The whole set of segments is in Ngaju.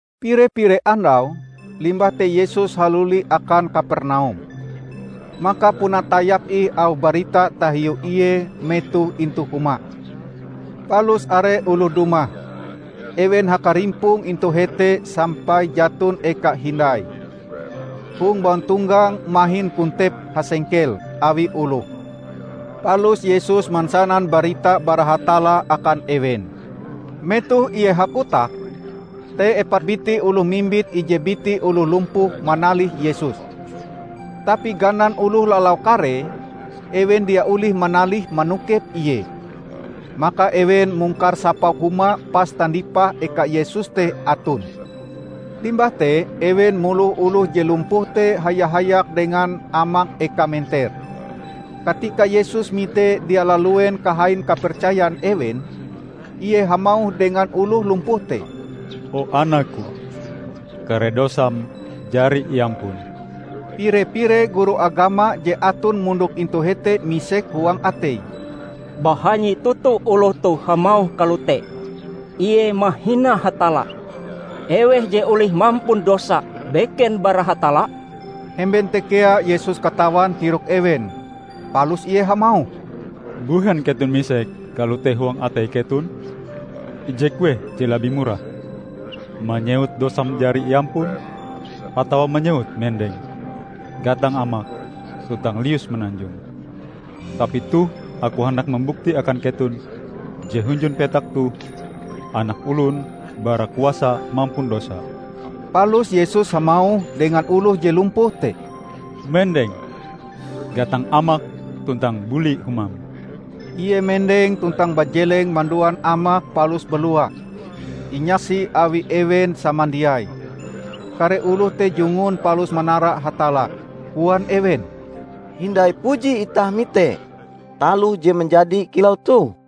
Pire-pire andau limbah te Yesus haluli akan Kapernaum. Maka puna tayap ih auh barita tahiu Ie metohe intu huma. Palus are oloh dumah. Ewen hakarimpong intu hete sampai jaton eka hindai. Hong bauntonggang mahin kontep hasengkel awi oloh. Palus Yesus mansanan barita bara Hatalla akan ewen. Metoh Ie hakotak, te epat biti oloh mimbit ije biti oloh lumpuh manalih Yesus. Tapi ganan oloh lalau karee, ewen dia olih manalih manokep Ie. Maka ewen mungkar sapau huma pas tandipah eka Yesus te aton. Limbah te ewen moloh oloh je lumpuh te haya-hayak dengan amak ekae menter. Katika Yesus mite dia laluen kahain kapercayan ewen, Ie hamauh dengan oloh lumpuh te, "O Anak-Ku, kare dosam jari iampun." Pire-pire guru agama je aton mondok intu hete misek huang ateie, "Bahanyi toto oloh toh hamauh kalote! Ie mahina Hatalla. Eweh je olih mampun dosa beken bara Hatalla?" Hemben te kea Yesus katawan tirok ewen. Palus Ie hamauh, "Mbuhen keton misek kalote huang atei keton? Ije kueh je labih murah: manyewut, 'Dosam jari iampun', atawa manyewut 'Mendeng, gatang amakm tuntang lius mananjong'? Tapi toh aku handak mambukti akan keton je hunjun petak toh Anak Olon bara kuasa mampun dosa." Palus Yesus hamauh dengan oloh je lumpuh te, "Mendeng, gatang amakm tuntang buli humam!" Ie mendeng tuntang bajeleng manduan amake palus balua, inyaksi awi ewen samandiai. Kare oloh te jungun palus manara Hatalla. Koan ewen, "Hindai puji itah mite taloh je manjadi kilau toh!"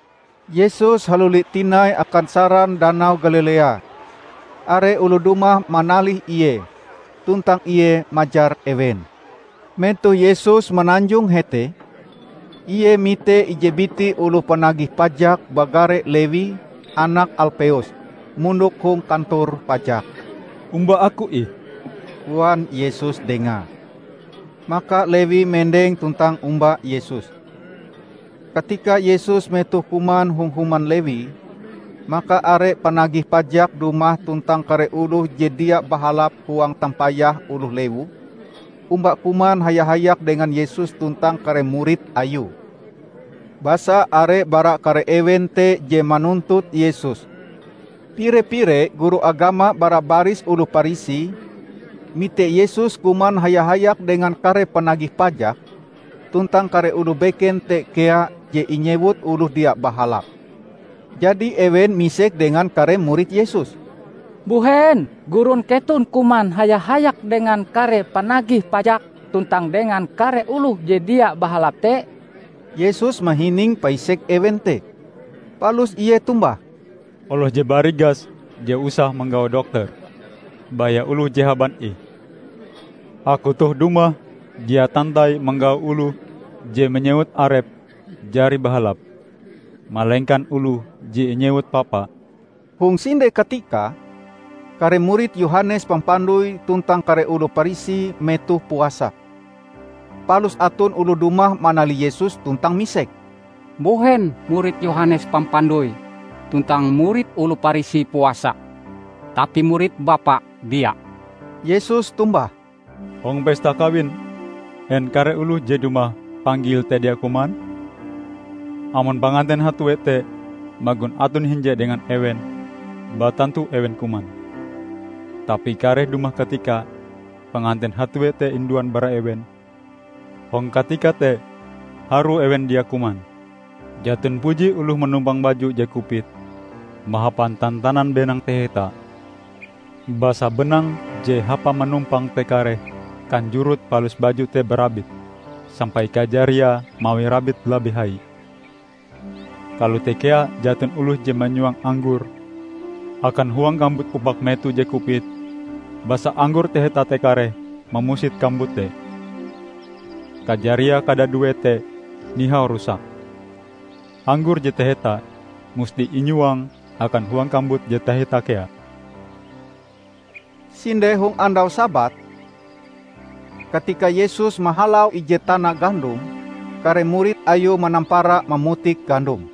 Yesus haluli tinai akan saran Danau Galilea. Are oloh dumah manalih Ie, tuntang Ie majar ewen. Metoh Yesus mananjong hete, Ie mite ije biti oloh panagih pajak bagare Lewi, anak Alpeus, mondok hong kantor pajak. "Omba aku ih," koan Yesus dengae. Maka Lewi mendeng tuntang omba Yesus. Katika Yesus metohe kuman hong human Lewi, maka are panagih pajak dumah tuntang kare oloh je dia bahalap huang tampayah oloh lewu, omba kuman haya-hayak dengan Yesus tuntang kare murid Ayue. Basa are bara kare ewen te je manuntut Yesus. Pire-pire guru agama bara baris oloh Parisi mite Yesus kuman haya-hayak dengan kare panagih pajak tuntang kare oloh beken te kea je inyewut oloh dia bahalap. Jadi ewen misek dengan kare murid Yesus, "Mbuhen gurun keton kuman haya-hayak dengan kare panagih pajak tuntang dengan kare oloh je dia bahalap te?" Yesus mahining paisek ewen te, palus Ie tombah, "Oloh je barigas dia usah manggau dokter; baya oloh je haban ih. Aku toh dumah dia tantai manggau oloh je manyewut arepe jari bahalap, malengkan oloh je inyewut papa." Hong sinde katika kare murid Yohanes Pampandoi tuntang kare oloh Parisi metohe puasa. Palus aton oloh dumah manalih Yesus tuntang misek, "Mbuhen murid Yohanes Pampandoi tuntang murid oloh Parisi puasa, tapi murid Bapa dia?" Yesus tombah, "Hong pesta kawin, en kare oloh je dumah panggil te dia kuman? Amon panganten hatue te magon aton hinje dengan ewen, batantu ewen kuman. Tapi kareh dumah katikae panganten hatue te induan bara ewen. Hong katika te harue ewen dia kuman. Jaton puji oloh manumpang baju je kupit mahapan tantanan benang taheta. Basa benang je hapa manumpange te kareh kanjorot palus baju te barabit, sampai kajariae mawi rabite labih hai. Kalote kea jaton oloh je manyuang anggor akan huang kambut upak meto je kupit. Basa anggor taheta te kareh mamusit kambut te. Kajariae kadaduee te nihau rusak. Anggor je taheta musti inyuang akan huang kambut je taheta kea!" Sinde hong andau Sabat, katika Yesus mahalau ije tana gandum, kare murid Ayue manampara mamutik gandum.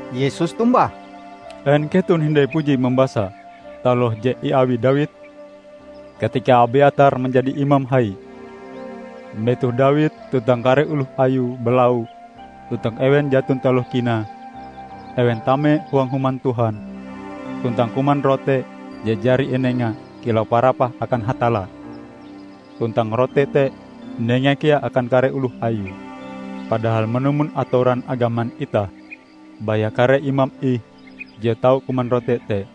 Yesus tombah, "En keton hindai puji mambasa taloh je iawi Dawid, katika Abyatar manjadi imam hai. Metoh Dawid tuntang kare oloh ayue balau, tuntang ewen jaton taloh kinae, ewen tame huang Human Tuhan, tuntang kuman rote je jari inenga kilau parapah akan Hatalla. Tuntang rote te inengae kea akan kare oloh ayue. Padahal manumon atoran agaman itah, baya kare imam ih je tau kuman rote te."